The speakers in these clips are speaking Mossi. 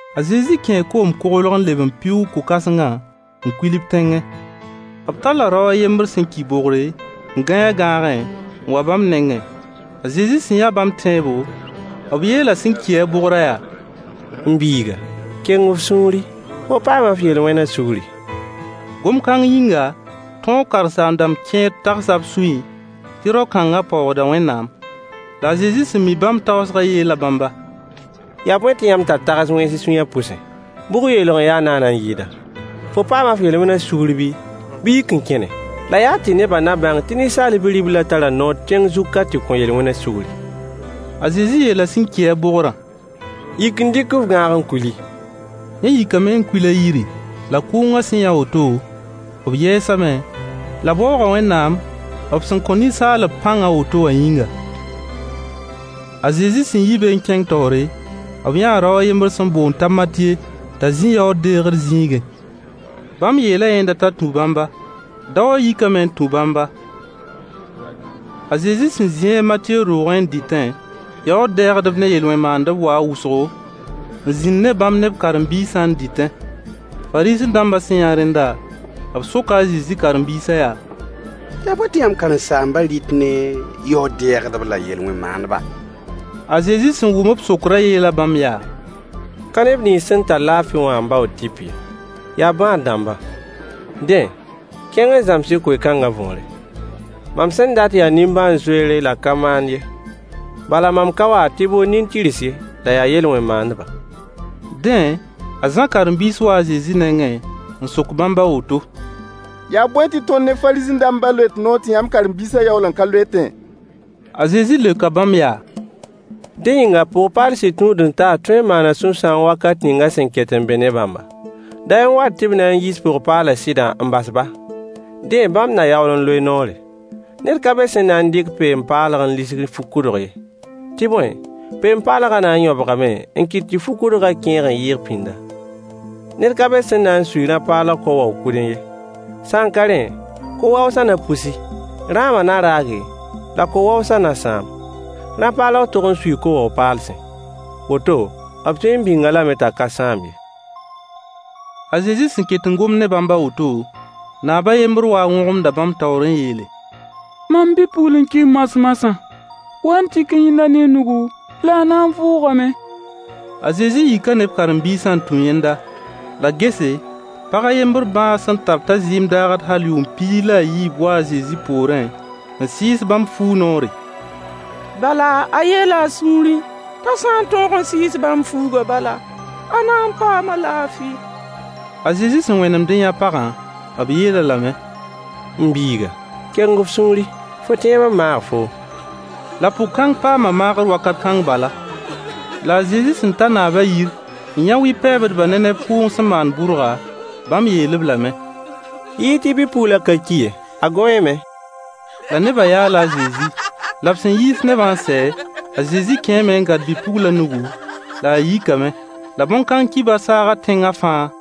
A Zezi kẽe koom-koglg n leb n pɩʋʋg ko-kãsengã n kuil b tẽngẽ. B talla rao a yembr sẽn ki bogre, n gãe a gãagẽ, n wa bãmb nengẽ. A Zezi sẽn yã bãmb tẽebo, b yeela sẽn ki-a bogrã yaa: M biiga, keng f sũuri! Fo paama f yel-wẽnã sugri. Gom-kãng yĩnga, tõog karen-saam-dãmb kẽer tagsa b sũyẽ tɩ rao-kãnga paoogda Wẽnnaam. La a Zezi sẽn mi bãmb tagsgã yeela bãmba: Yaa bõe tɩ yãmb tar tags wẽns y sũyã pʋse? Bʋg yeelg n ya naana n yɩɩda: “Fo paama f yel-wẽna sugr bii, bɩ yik n kẽne?” La yaa tɩ nebã na bãng tɩ Ninsaal Bi-riblã tara noor tẽng zug ka tɩ kõ yel-wẽnã sugri. A Zezi yeela sẽn ki-a bogrã: Yik n dɩk f gãag n kuili. Yẽ yikame n kuil a yiri. La kʋʋngã sẽn yã woto, b yɛɛsame la b waooga Wẽnnaam b sẽn kõ ninsaalb pãng a woto wã yĩnga. A Zezi sẽn yi be n kẽng taoore, b yãa rao a yembr sẽn boond t'a Matye t'a zĩ yaood-deegr zĩigẽ. Bãmb yeela yẽnda t'a tũ bãmba. Daowã yikame n tũ bãmba. A Zezi sẽn zĩ a Matye roogẽ n dɩtẽ, yaood-dɛɛgdb ne yel-wẽn maandb waa wʋsgo, n zĩnd ne bãmb ne b karen-biisã n dɩtẽ. Fariisẽ-dãmba sẽn yã rẽnda, b soka a Zezi karen-biisã yaa: Yaa bõe tɩ yãmb karen-saambã rɩt ne yaood-dɛɛgdb la yel-wẽn maandba? A Zezi sẽn wʋm b sokrã yeela bãmb yaa: Ka neb nins sẽn tar laafɩ wã n baood tɩp ye, yaa bãad-dãmba. Dẽ, kẽng n zãms-y koe-kãngã võore: “Mam sẽn dat yaa nimbãan-zoeere la ka maand ye.” Bala mam ka wa tɩ bool nin-tɩrs ye la yaa yel-wẽn maandbã. Dẽ, a Zã karen-biis waa a Zezi nengẽ n sok bãmb a woto: Yaa bõe tɩ tõnd ne Fariisẽ-dãmbã loet noor tɩ yãmb karen-biisã yaool n ka loetẽ? A Zezi leoka bãmb yaa: Dẽ yĩnga pʋg-paal sɩd tũud-n-taas tõe n maana sũ-sãoong wakat ninga a sẽn ket n be ne bãmba? Day n wat tɩ b na n yiis pʋg-paalã sɩdã n bas-ba. Dẽ bãmb na yaool n loe noore. Ned ka be sẽn na n dɩk peen-paalg n lisg fu-kʋdg ye. Tɩ bõe, peen-paalgã na n yõbgame n kɩt tɩ fu-kʋdgã kẽeg n yɩɩg pĩnda. Ned ka be sẽn na n sui rã-paalg ko-wao-kʋdẽ ye. Sã n ka rẽ, ko-waoosã na pusi, rãamã na raage, la ko-waoosã na sãam. Rã-paalg tog n suii ko-wao-paalsẽ. Woto b tõe n bĩng-a lame t'a ka sãam ye. A Zezi sẽn ket n gomd ne bãmb a woto, naab a yembr waa n wõgemda bãmb taoor n yeele: Mam bi-pugl n ki moas-moasã. Wa-y n tik-y yẽnda ne y nugu la a na n vʋʋgame. A Zezi yika ne b karen-biisã n tũ yẽnda. La gese, pag a yembr bãag sẽn tar t'a zɩɩm daagd hal yʋʋm piig la a yiib waa a Zezi poorẽ n sɩɩs bãmb fuug noore. Bala a yeela a sũurẽ t'a sã n tõog n sɩɩs bãmb fuugã bala, a na n paama laafɩ. A Zezi sẽn wẽnemd n yã pagã, b yeel-a lame: M biiga, keng f sũuri! Fo tẽeb n maag foom. La pʋg-kãng paama maagr wakat kãng bala. La a Zezi sẽn ta naabã yir n yã wɩ-pɛɛbdbã ne neb kʋʋng sẽn maand bʋrga, bãmb yeel-b lame: Yi-y tɩ bi-puglã ka ki ye, a gõeeme. La nebã yaala a Zezi. La b sẽn yiis nebã n sɛ, a Zezi kẽeme n gãd bi-puglã nugu, la a yikame. La bõn-kãng kibar saaga tẽngã fãa.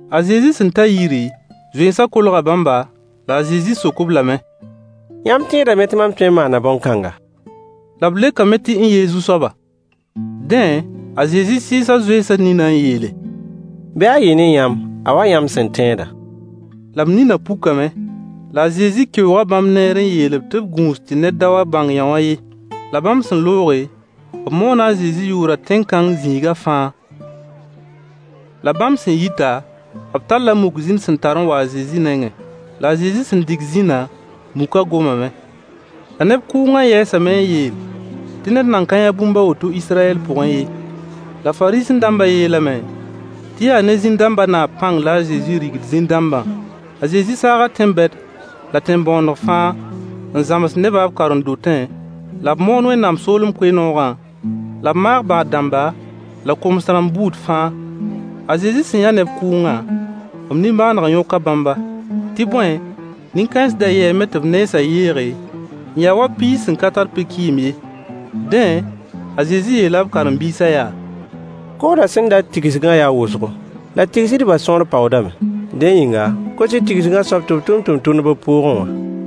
A Zezi sẽn ta yiri, zoensã kolga bãmba, la a Zezi sok-b lame: Yãmb tẽedame tɩ mam tõe n maana bõn-kãnga? La b leokame tɩ n-ye Zu-soaba. Dẽ a Zezi sɩɩsa zoensã ninã n yeele: Bɩ a yɩ ne yãmb a wa yãmb sẽn tẽedã. La b ninã pukame. La a Zezi keooga bãmb neer n yeel-b tɩ b gũus tɩ ned da bãng yõwã ye. La bãmb sẽn looge, b moona a Zezi yʋʋrã tẽn-kãng zĩiga fãa. La bãmb sẽn yita, b talla muk zĩn sẽn tar n wa a Zezi nengẽ. La a Zezi sẽn dig zĩnã, mukã gomame. La neb kʋʋngã yɛɛsame n yeel tɩ ned nan ka yã bũmb a woto Israyɛl pʋgẽ ye. La Fariisẽ-dãmbã yeelame tɩ yaa ne zĩn-dãmbã naab pãng la a Zezi digd zĩn-dãmbã. A Zezi saaga tẽn-bɛd la tẽn-bõoneg fãa n zãms nebã b karen-dotẽ, la b moon Wẽnnaam soolem koe-noogã, la b maag bãad-dãmba la koms-rãmb buud fãa. A Zezi sẽn yã neb kʋʋngã, b nimbãaneg yõka bãmba. Tɩ bõe, nin-kãens da yɛɛme tɩ b nensã yeege, n ya wa piis sẽn ka tar pe-kɩɩm ye. Dẽ a Zezi yeela b karen-biisã yaa: Koodã sẽn dat tigsgã yaa wʋsgo, la tigsdbã sõor paoodame. Dẽ yĩnga, kos-y tigsgã soab tɩ b tʋm tʋmtʋmdb b pʋʋgẽ wã.